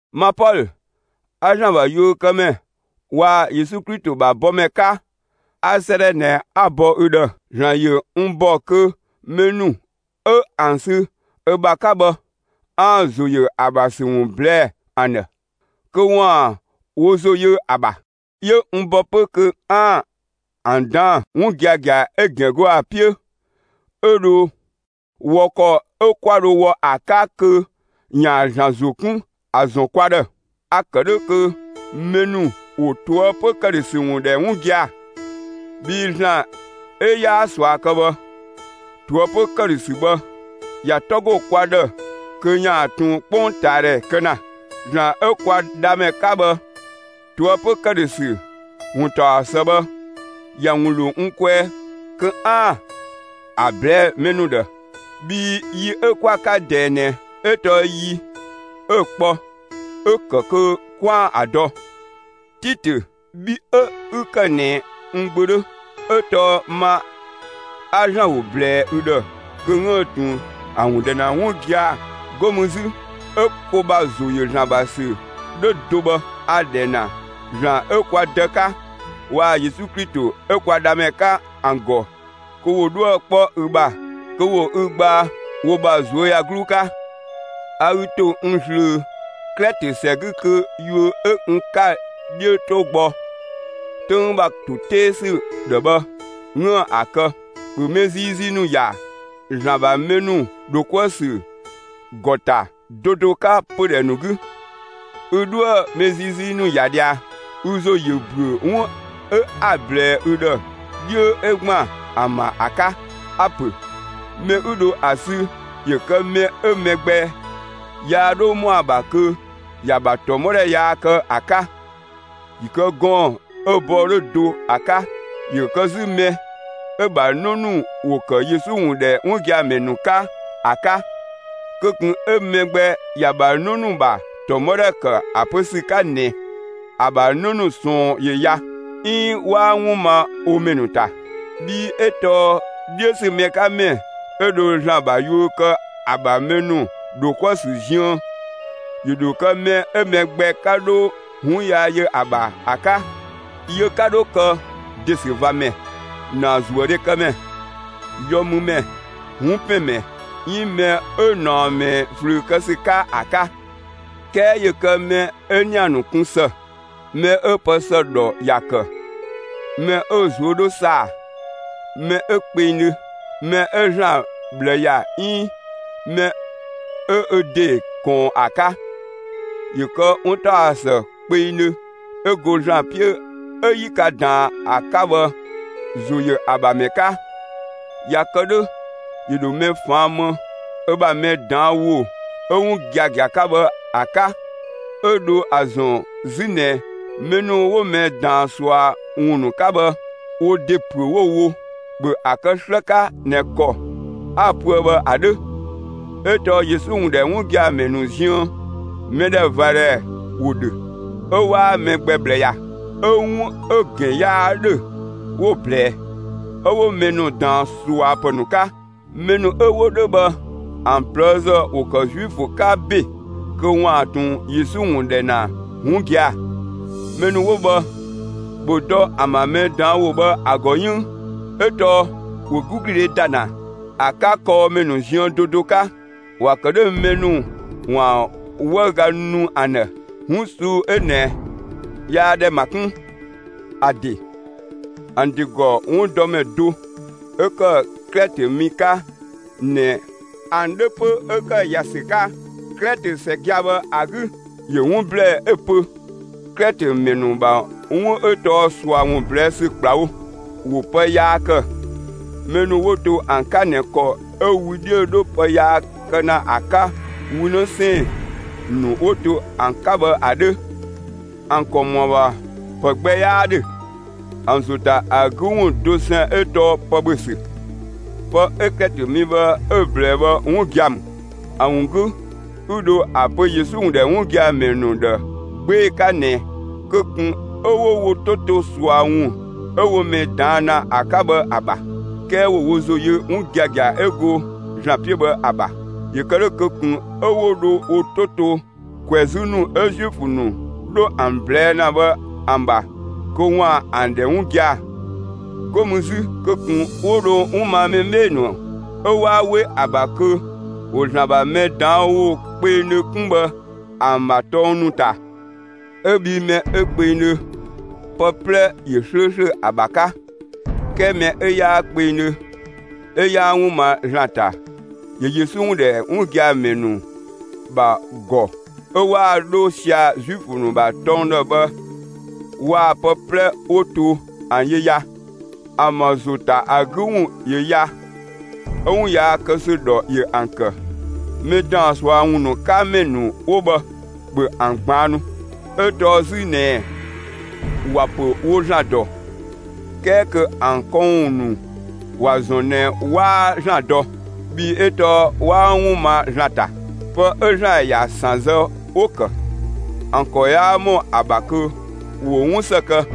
Ma Pɔlö 'a ‑Zlan ‑bha yuökëmɛ waa‑ Yesu Klito ‑bha bɔmɛ 'ka, 'a 'sëëdhɛ ꞊nɛ 'a‑ bɔ ü ‑dhë. ‑Zlan ‑yö n ‑bɔ kö mɛ ‑nu 'ö ‑an sü ö ‑bha 'ka bhë, 'aan‑ ‑zo ‑yö ö ‑bha ‑sü ‑wun ꞊blɛɛ'‑ ‑an ‑dhë, kö ‑waan wo ‑zo yö ‑a ‑bha. 'Yö n bɔ 'pö kö 'aan‑ ‑an ꞊daan'‑, 'wun giagia 'ö‑ ‑gɛn go ‑a 'piö, 'ö dho wɔ ‑kɔ 'ö 'kwa dho wɔ ‑a 'ka kö ‑yaan ‑Zlan ‑zo 'kun ‑a ‑zɔn kwa ‑dhë. A‑ ‑kë 'dhö kö mɛ ‑nu ‑wo ꞊toëpö ‑këdhösü ‑wun ‑dhɛ 'wun gia‑. Bhii ‑Zlan 'ö 'yaa ꞊sua kë bhë, ꞊toëpö ‑këdhösü bhë, ‑ya 'tɔ ‑go kwa ‑dhë kö ‑yaan ꞊tun 'kpongtaadhɛ kë ‑na. ‑Zlan 'ö kwa Dhamɛ 'ka bhë, ꞊toëpö ‑këdhösü ‑wuntaɔsë bhë, ‑ya ‑wun ‑lo n kwɛɛ kö 'aan‑ ‑a ꞊blɛɛ'‑ mɛ ‑nu ‑dhë. Bhii yi 'ö 'kwa‑ 'ka ꞊dɛɛ ꞊nɛ 'ö tɔɔ yi 'ö‑ kpɔ 'ö‑ ‑kë kö 'kwaan‑ ‑a dɔ. [Titö bhi 'ö 'ü ‑kë ꞊nɛ n gbö 'dhö, 'ö tɔɔ ma 'a ‑Zlan ‑wo ꞊blɛɛ ü ‑dhë kö 'üën‑ ꞊tun ‑a ‑wun ‑dhɛ ‑na 'wun gia‑, 'go mü 'zü 'ö ko ‑bha ‑zo ‑yö ‑Zlan ‑bha ‑sü 'dhö do bhë,] a‑ ‑dhɛ ‑na ‑Zlan 'ö kwa Dë 'ka waa‑ Yesu Klito 'ö kwa Dhamɛ 'ka ‑an ‑gɔ kö ‑wo 'dhuë‑ 'kpɔ ü ‑bha, kö ‑wo ü gbaa wo ‑bha ꞊zuöyagluu 'ka. A ü ‑to n ꞊zlöö Klɛtö ‑sɛ 'gü kö yuö 'ö n 'ka‑ 'dhiö 'to gbɔ, 'töng ‑bha ‑to 'tee ‑sü ‑dhë bhë, 'üën‑ ‑a kë. ‑Bhö mɛ ziizii ‑nu ‑ya ‑Zlan ‑bha mɛ ‑nu ‑dho 'kuë‑ ‑sü ‑gɔ ‑ta do do 'ka pödhɛ ‑nu 'gü! Ü 'dhoë‑ mɛ ziizii ‑nu ‑ya ꞊dhia, ü ‑zo ‑yö ‑büö 'wun 'ö 'a‑ ꞊blɛɛ ü ‑dhë 'dhiö 'ö ‑gban ‑an ‑bha ‑a 'ka. A‑ ‑pö mɛ 'ü dho ‑a sü ‑yö kë mɛ 'ö mɛ gbɛ yaa 'dho ‑mɔa ‑bha kö ‑ya ‑bha ‑tɔmɔdhɛ yaa kë ‑a 'ka. ‑Yö kë gɔɔn‑ 'ö‑ bɔɔ 'dhö do ‑a 'ka. ‑Yö kë 'zü mɛ 'ö‑ ‑bha 'në ‑nu ‑wo ‑kë Yesu ‑wun ‑dhɛ 'wun gia‑ ‑mɛ ‑nu 'ka ‑a 'ka. Kö ꞊kun 'ö mɛ gbɛ ‑ya ‑bha 'në ‑nu ‑bha ‑tɔmɔdhɛ ‑kë ‑a pö ‑sü 'ka ꞊nɛ ‑a ‑bha 'në ‑nu ꞊sɔɔn ‑yö ya, 'iin 'waa 'wun ma wo ‑mɛ ‑nu ‑ta. Bhii 'ö tɔɔ 'dhiö ‑sü mɛ 'ka ‑mɛ 'ö dho ‑Zlan ‑bha yuö kë ‑a ‑bha mɛ ‑nu ‑dho 'kuë‑ ‑sü ziën, ‑yö ‑dho kë mɛ 'ö mɛ gbɛ 'ka 'dho 'wun yaa yö ‑a ‑bha ‑a 'ka. Yö 'ka 'dho kë ‑desüvamɛ, ‑naazuëdhekëmɛ, yɔmümɛ, 'wunpɛnmɛ, 'iin mɛ 'ö ꞊naɔ ꞊mɛɛ ꞊flüü kë ‑sü 'ka ‑a 'ka. 'Kɛɛ ‑yö kë mɛ 'ö ‑nia ‑nu kun ‑së, mɛ 'ö pë ‑së ‑dhɔ ‑ya ‑kë, mɛ 'ö‑ ꞊zuö' 'dhö ‑saa, mɛ 'ö kpengdhö, mɛ 'ö ‑Zlan ꞊bhlë ‑ya 'iin mɛ 'ö ö ‑de ꞊kɔɔn ‑a 'ka. ‑Yö kë 'wuntaɔsë kpengdhö 'ö go ‑Zlan 'piö 'ö 'yi ka ꞊daan ‑a 'ka bhë, ‑zo ‑yö ‑a ‑bha ‑mɛ 'ka. ꞊Ya kë 'dhö ‑yö ‑dho mɛ ꞊faan' më ö ‑bha mɛ ꞊daan' ‑wo 'ö 'wun giagia 'ka bhë ‑a 'ka, 'ö dho ‑a ‑zɔn 'zü ꞊nɛ mɛ ‑nu 'wo mɛ ꞊daan ꞊sua ‑wun ‑nu 'ka bhë, wo ‑de ‑püö 'wo‑ wo. ‑Bhö ‑a kë 'slë 'ka ꞊nɛ ‑kɔ 'a‑ pöë bhë ‑a 'dhö! 'Ö tɔɔ Yesu ‑wun ‑dhɛ 'wun gia‑ ‑mɛ ‑nu ziën, mɛdhɛvadhɛ ‑wo ‑dhö, 'ö 'waa mɛ gbɛ ꞊bhlë ‑ya, 'ö 'wun 'ö‑ ‑gɛn 'yaa 'dhö 'wo‑ ꞊blɛɛ, 'ö 'wo mɛ ‑nu ꞊daan ꞊suapë ‑nu 'ka. Mɛ ‑nu 'ö 'wo 'dhö bhë ‑an ꞊plëëzë ‑wo ‑kë Zuifö 'ka ‑be kö ‑waan ꞊tun Yesu ‑wun ‑dhɛ ‑na 'wun gia‑. Mɛ ‑nu 'wo bhë, ‑bhö dɔ ‑an ‑bha mɛ ꞊daan' ‑wo bhë ‑a ‑gɔ 'yënng, 'ö tɔɔ ‑wo 'gügludhe ‑da ‑na ‑a 'ka kɔɔmɛ ‑nu ziën do do 'ka. ‑Wa ‑kë 'dhö mɛ ‑nu ‑waan 'wëüga nu ‑an ‑dhë. 'Wun ꞊suu'‑ 'ö ꞊nɛ, yaa ‑dhɛ ‑ma 'kun! ‑A ‑de ‑an ‑de ‑gɔ 'wundɔmɛ do 'ö ‑kë Klɛtö mi 'ka ꞊nɛ ‑an 'dhö 'pö 'ö ‑kë ‑ya ‑sü 'ka Klɛtö ‑sɛ gia‑ bhë ‑a 'gü, ‑yö 'wun ‑blɛɛ 'ö‑ pö: «Klɛtö ‑mɛ ‑nu ‑bha 'wun 'ö tɔɔ ꞊sua ‑wun ꞊blɛɛ' ‑sü ‑kplawo. ‑Wo pë yaa ‑kë, mɛ ‑nu 'wo to ‑an 'ka ꞊nɛ ‑kɔ 'ö wü 'dhiö‑ 'dho pë yaa kë ‑na ‑a 'ka wü 'në 'sɛɛn‑ ‑nu 'wo to ‑an 'ka bhë ‑a 'dhö. ‑An ‑kɔ ‑mɔa ‑bha ‑pë gbɛ 'yaa 'dhö. ‑An ‑zo ‑ta ‑a 'gü ‑wun dosɛn 'ö tɔɔ pë ‑bhö ‑sü.» Pë 'ö Klɛtö mi bhë 'ö‑ ꞊blɛɛ bhë 'wun gia‑ ‑mü. ‑A ‑wun 'gü 'ü dho ‑a pö Yesu ‑wun ‑dhɛ 'wun gia‑ ‑mɛ ‑nu ‑dhë 'gbee‑ 'ka ꞊nɛ kö ꞊kun 'ö 'wo wo 'to to ꞊sua ‑wun 'ö 'wo mɛ ꞊daan' ‑na ‑a 'ka bhë ‑a ‑bha; 'kɛɛ ‑wo wo ‑zo yö 'wun giagia 'ö go ‑Zlan 'piö bhë ‑a ‑bha. ‑Yö kë 'dhö kö ꞊kun 'ö 'wo dho wo 'to to ꞊kwɛzü ‑nu 'ö Zuifö ‑nu 'dho ‑an ꞊blɛɛ' ‑na bhë ‑an ‑bha kö ‑waan ‑an ‑dhɛ 'wun gia‑. 'Go mü 'zü kö ꞊kun 'wo dho 'wun ma mɛ 'bhee‑ ‑nu 'ö 'waa 'we ‑a ‑bha kö ‑wo ‑Zlan ‑bha mɛ ꞊daan' ‑wo kpengdhö kun bhë ‑an ‑bha tɔng ‑nu ‑ta; 'Ö bhii mɛ 'ö kpengdhö, pë 'plɛ ‑yö 'slööslö ‑a ‑bha 'ka. 'Kɛɛ mɛ 'ö 'yaa kpengdhö 'ö 'yaa 'wun ma ‑Zlan ‑ta, ‑yö Yesu ‑wun ‑dhɛ 'wun gia‑ ‑mɛ ‑nu ‑bha ‑gɔ 'ö 'waa ‑a 'dho sia‑ Zuifö ‑nu ‑bha tɔng ‑dhë bhë waa‑ pë 'plɛ 'wo to ‑an yö ya. ‑An ‑bha ‑zo ‑ta ‑a 'gü ‑wun ‑yö ya, 'ö 'wun yaa kë ‑sü ‑dhɔ ‑yö ‑an ‑kë. (Mɛ ‑daan ꞊sua ‑wun ‑nu 'ka ‑mɛ ‑nu 'wo bhë, ‑bhö ‑an ꞊gbaannu,) 'ö tɔɔ 'zü ꞊nɛɛ ‑wa ‑pö wo ‑Zlan ‑dɔ, 'kɛɛ kö ‑an këwun ‑nu ‑wa ‑zɔn ꞊nɛ 'waa ‑Zlan dɔ. Bhii 'ö tɔɔ 'waa 'wun ma ‑Zlan ‑ta; pë 'ö ‑Zlan ‑ya ‑san zë 'wo‑ ‑kë; ‑an ‑kɔ 'yaa ‑mɔ ‑a ‑bha kö ‑wo 'wun ‑së kë.